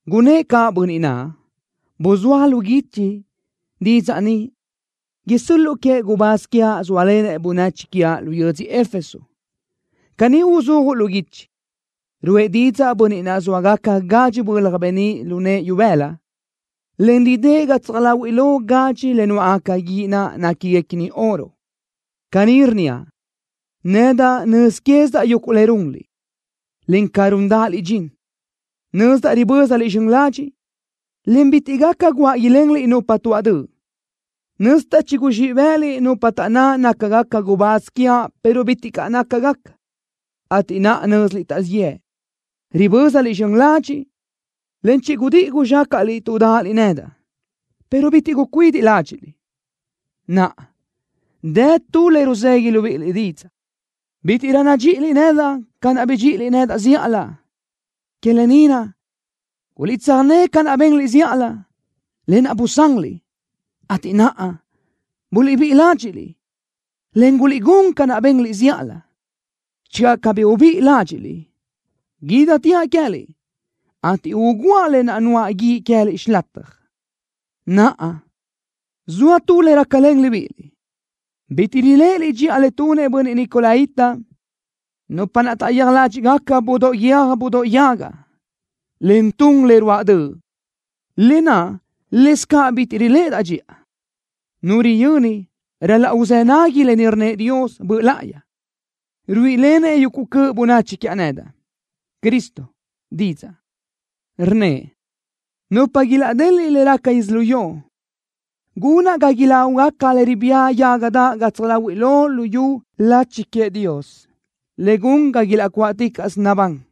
Gunnë́ʼ caʼ Bönniʼ naʼ: “Buzúaj lu guichi didzaʼ ni isö́l-luʼu queëʼ gubáz quiaʼ zóalenëʼ bönachi quiaʼ lu yödzö Éfeso. Caní uzúajuʼ lu guichi: Ruʼë didzaʼ Bönniʼ naʼ zxóagacabaʼ gadxi bölaj beníʼ lu nëʼë ibëla, en ridë́ʼ gatsaj láhuiʼlö gadxi le nuáʼgaca guíʼ naʼ néquiguequini oro. Caní rnníaʼ: Nedaʼ nöz quézidaʼ yuguʼ le runliʼ, en ca rúndaʼaliʼ dxin. Nözdaʼ ribö́zaliʼ zxön ladxiʼ, en bitiʼ gaca guáʼ ilenliʼ nupa tuaʼ döʼ. Nözdaʼ chiguzxíʼ bë́ʼëliʼ nupa taʼnná nácagaca gubáz quiaʼ pero bitiʼ caʼ nácagaca, ateʼ naʼa nö́ziliʼ taʼzíʼ yëʼ. Ribö́zaliʼ zxön ladxiʼ, en chigudíʼi guzxácaʼliʼ tuʼ dáʼaliʼ nedaʼ, pero bitiʼ gucuidiʼ ládxiʼliʼ. Naʼa, dë tu le ruzegui libíʼiliʼ didzaʼ: Bítiʼrö nadxíʼiliʼ nedaʼ ca naʼ bidxíʼiliʼ nedaʼ zíʼalö. Que lë ni naʼ, guliʼtsöjné ca naʼ benliʼ zíʼalö, lë naʼ busanliʼ, ateʼ naʼa, buliʼbíʼi ládxiʼliʼ, en guliʼgún ca naʼ benliʼ zíʼalö. Channö cabí ubíʼi ládxiʼliʼ, guídatiaʼ queë́liʼ, ateʼ ugúaʼ le nuáʼ guíʼ queë́liʼ xilataj. Naʼa, zoa tu le rácalen libíʼiliʼ. Bitiʼ riléʼeliʼ dxiʼa le tunëʼ bönniʼ nicolaíta, nupa naʼ taʼyéaj ládxiʼgaca budóʼ guiö́j budóʼ yaga, en tun le ruáʼ döʼ, lë naʼ lëscaʼ bitiʼ riléʼedaʼ dxiʼa. Nu riyöni ral-laʼ uzë́ nagui lë ni rnnëʼ Dios Böʼ Láʼayi, ruíʼilenëʼ yuguʼ cöʼ bönachi quiaʼ nedaʼ, Cristo, didzaʼ, rnnëʼ: Nupa ilaʼdeliʼ lu le raca yödzölió, gunaʼ ga ilágugaca le ribía yaga daʼ gatsaj láhuiʼlö luyú lachi queëʼ Dios, le gun ga ilaʼcuáʼticaʼsö nabán.”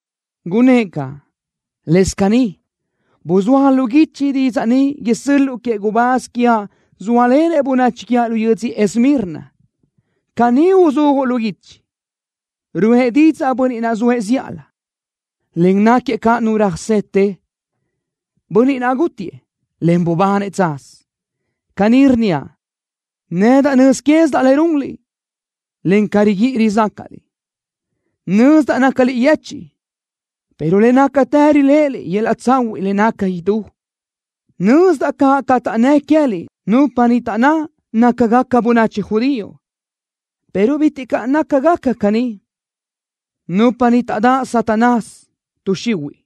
Gunnë́ʼ caʼ: “Lëscaʼ caní, buzúaj lu guichi didzaʼ ni isö́l-luʼu queëʼ gubáz quiaʼ zóalenëʼ bönachi quiaʼ lu yödzö Esmirna. Caní uzúajuʼ lu guichi: Ruʼë didzaʼ Bönniʼ naʼ zoëʼ zíʼalö, en náquiëʼ caʼ Nu röjsete, Bönniʼ naʼ gútiëʼ, en bubanëʼ tsaz. Caní rnníaʼ: Nedaʼ nöz quézidaʼ le runliʼ, en ca riguíʼi rizácaʼliʼ. Nözdaʼ nácaliʼ yechiʼ, pero le nácatë riléʼeliʼ yöl-laʼ tsahuiʼ le naca idú. Nözdaʼ caʼ ca taʼnnë́ queë́liʼ nupa niʼ taʼnná nácagaca bönachi judío, pero bitiʼ caʼ nácagaca caní. Nupa ni taʼdáʼ Satanás, tuʼ xihuiʼ.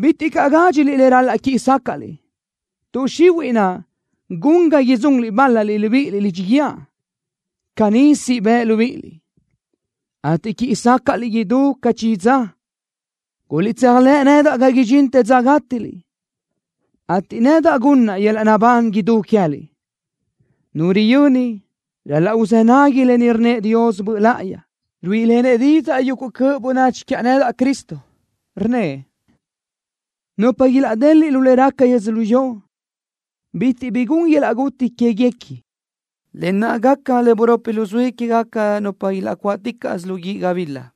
Bitiʼ caʼ gádxiliʼ le ral-laʼ quíʼi sácaʼliʼ. Tuʼ xihuiʼ naʼ gun ga idzunliʼ bál-laliʼ libíʼiliʼ lidxi guíë. Caní siʼ bëʼ libíʼiliʼ, ateʼ quíʼi sácaʼliʼ idú ca chi dza. Guliʼtséajlëʼ nedaʼ ga idxintë dza gátiliʼ, ateʼ nedaʼ gunnaʼ yöl-laʼ naʼbán idú queë́liʼ. Nu riyöni ral-laʼ uzë́ nagui lë ni rnnëʼ Dios Böʼ Láʼayi, ruíʼilenëʼ didzaʼ yuguʼ cöʼ bönachi quiaʼ nedaʼ, Cristo, rnnëʼ: Nupa ilaʼdeliʼ lu le raca yödzölió, bitiʼ bi gun yöl-laʼ guti quéguequi, lë naʼ gaca le buropi luzuí quégaca nupa ilaʼcuáʼticaʼsö lu guíʼ gabila.”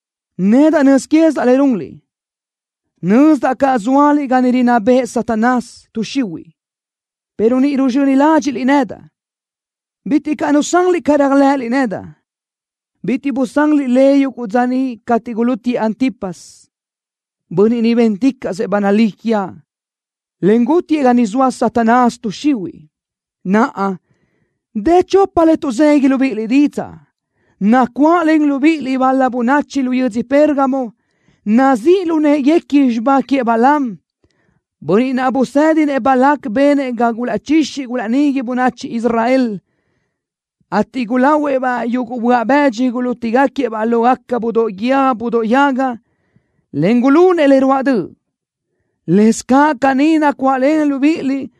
Nedaʼ nöz quézidaʼ le runliʼ. Nözdaʼ caʼ zóaliʼ ga niʼ rinná bëʼ Satanás, tuʼ xihuiʼ, pero ni ruzxöni ládxiʼliʼ nedaʼ. Bitiʼ caʼ nusanliʼ ca réajlëʼëliʼ nedaʼ. Bitiʼ busanliʼ le yuguʼ dza niʼ cateʼ gulútiëʼ Antipas, bönniʼ niʼ bénticaʼsëʼ ba nalí quiaʼ, en gútiëʼ ga niʼ zoa Satanás, tuʼ xihuiʼ. Naʼa, dë tu chopa le tuʼzegui libíʼiliʼ didzaʼ: Nacuáʼlen libíʼiliʼ bal-la bönachi lu yödzö Pérgamo, nazíʼ lu në́ʼeguequi xibá queëʼ Balaam, bönniʼ niʼ busédinëʼ Balac benëʼ ga gulaʼchixi gulaʼnigui bönachi Israel, ateʼ gulahuëʼ-baʼ yuguʼ böaʼ bë́dxidoʼ gulútigaquiëʼ-baʼ lógaca budóʼ guiö́j budóʼ yaga, en gulunëʼ le ruáʼ döʼ. Lëscaʼ caní nacuáʼlen libíʼiliʼ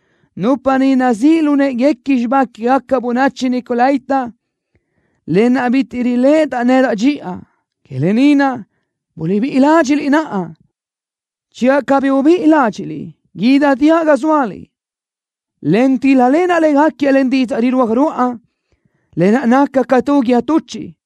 nupa niʼ nazíʼ lu në́ʼeguequi xibá quégaca bönachi nicolaíta, lë naʼ bitiʼ riléʼedaʼ nedaʼ dxiʼa. Que lë ni naʼ, buliʼbíʼi ládxiʼliʼ naʼa. Channö cabí ubíʼi ládxiʼliʼ, guídateaʼ ga zóaliʼ, en tíl-lalenaʼ légaquiëʼ len didzaʼ rirúaj ruáʼa, le naca ca tu guíë tuchiʼ.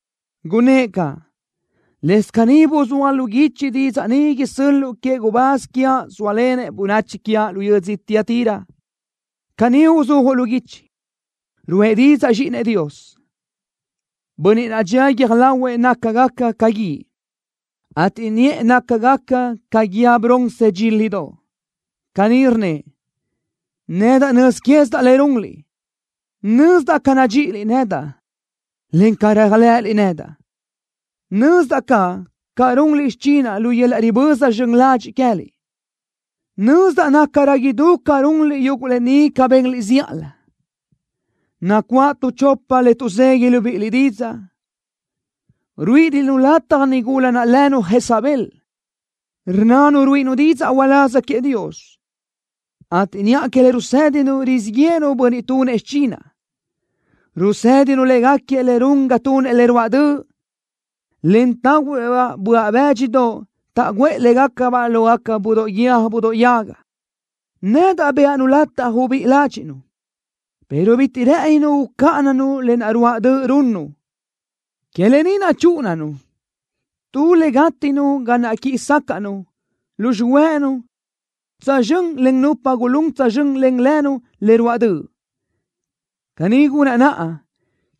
Gunnë́ʼ caʼ: “Lëscaʼ caní, buzúaj lu guichi didzaʼ ni isö́l-luʼu queëʼ gubáz quiaʼ zóalenëʼ bönachi quiaʼ lu yödzö Tiatira. Caní uzúajuʼ lu guichi: Ruʼë didzaʼ Zxíʼinëʼ Dios, Bönniʼ naʼ dxía guiö́j lahuëʼ nácagaca ca guíʼ, ateʼ niʼë nácagaca ca guíë bronce dxílidoʼ. Caní rnnëʼ: Nedaʼ nöz quézidaʼ le runliʼ. Nözdaʼ ca nadxíʼiliʼ nedaʼ, en ca réajlëʼëliʼ nedaʼ. Nözdaʼ caʼ ca runliʼ xichinaʼ lu yöl-laʼ riböza zxön ladxiʼ queë́liʼ. Nözdaʼ nácarö idú ca runliʼ yuguʼ lë ni ca benliʼ zíʼalö. Nacuáʼ tu chopa le tuʼzegui libíʼiliʼ didzaʼ: Ruíʼiliʼ-nu lataj nigula naʼ lënu Jezabel, rnnanu ruíʼinu didzaʼ uláz queëʼ Dios, ateʼ niʼa que le rusédinu rizíʼ yéʼenu bönniʼ tunëʼ xichinaʼ. Rusédinu légaquiëʼ le run ga tunëʼ le ruáʼ döʼ, en tahuëʼ-baʼ böaʼ bë́dxidoʼ taʼguʼë légacabaʼ lógaca budóʼ guiö́j budóʼ yaga. Nedaʼ bëʼa-nu lataj ubíʼi ládxiʼnu, pero bitiʼ rë́ʼëninu ucáʼananu le ruáʼ döʼ naʼ runnu. Que lë ni naʼ chúʼunaʼ-nu tu le gátiʼnu ga naʼ quíʼi sácaʼnu lu xihuë́ʼënu tsözxö́n len nupa gulún tsözxö́n len lënu le ruáʼ döʼ. Caní gunaʼ naʼa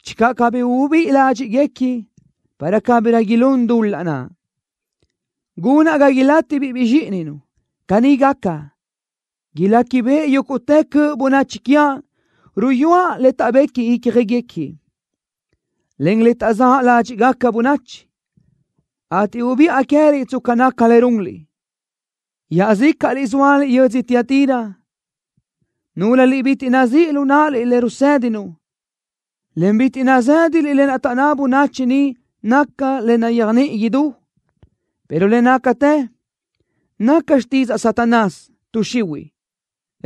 channö cabí uluʼbíʼi ládxiʼguequi para cabirö ilún dul-laʼ naʼ. Gunaʼ ga ilátibiʼ zxíʼininu. Caní gaca, iléquibeʼe yúguʼtë cöʼ bönachi quiaʼ ruyúaʼ le taʼbequi ícjaguequi, en le taʼzáʼ ládxiʼgaca bönachi, ateʼ ubiʼa queë́liʼ tsca naca le runliʼ. Iaʼzícaʼliʼ zóaliʼ yödzö Tiatira, núlöliʼ bitiʼ nazíʼ lu náʼaliʼ lë naʼ rusédinu, en bitiʼ nazë́daliʼ lë naʼ taʼnná bönachi niʼ naca le nayéajniʼi idú, pero le nácatë naca xtidzaʼ Satanás, tuʼ xihuiʼ,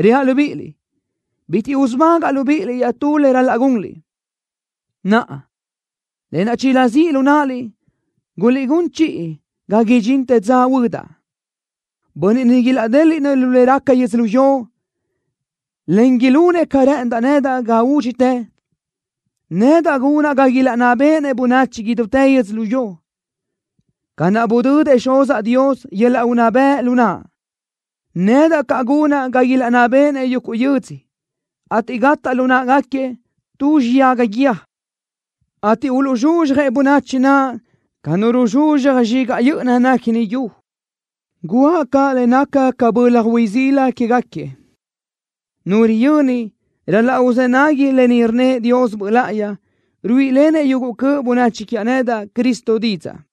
reaʼ libíʼiliʼ: Bitiʼ usubágaʼa libíʼiliʼ iaʼtú le ral-laʼ gunliʼ. Naʼa, lë naʼ chinazíʼ lu náʼaliʼ, guliʼgún chiʼi ga idxintë dza huödaʼ. Bönniʼ niʼ ilaʼdéliʼnëʼ lu le raca yödzölió, en ilunëʼ ca rë́ʼëndaʼ nedaʼ ga údxitë, nedaʼ gunaʼ ga ilaʼnná béʼenëʼ bönachi idútë yödzölió. Ca naʼ budödëʼ Xuzaʼ Dios yöl-laʼ unná bëʼ lu naʼa, nedaʼ caʼ gunaʼ ga ilaʼnná béʼenëʼ yuguʼ yödzö, ateʼ gataʼ lu náʼagaquiëʼ tu xiyaga guíë, ateʼ uluʼzxuzxjëʼ bönachi naʼ ca nu ruzxuzxaj zxigaʼ yö́ʼöna néquini yu. Guʼa caʼ le naca ca bölaj hui sila quégaquiëʼ. Nu riyöni ral-laʼ uzë́ nagui lë ni rnnëʼ Dios Böʼ Láʼayi, ruíʼilenëʼ yuguʼ cöʼ bönachi quiaʼ nedaʼ, Cristo, didzaʼ.”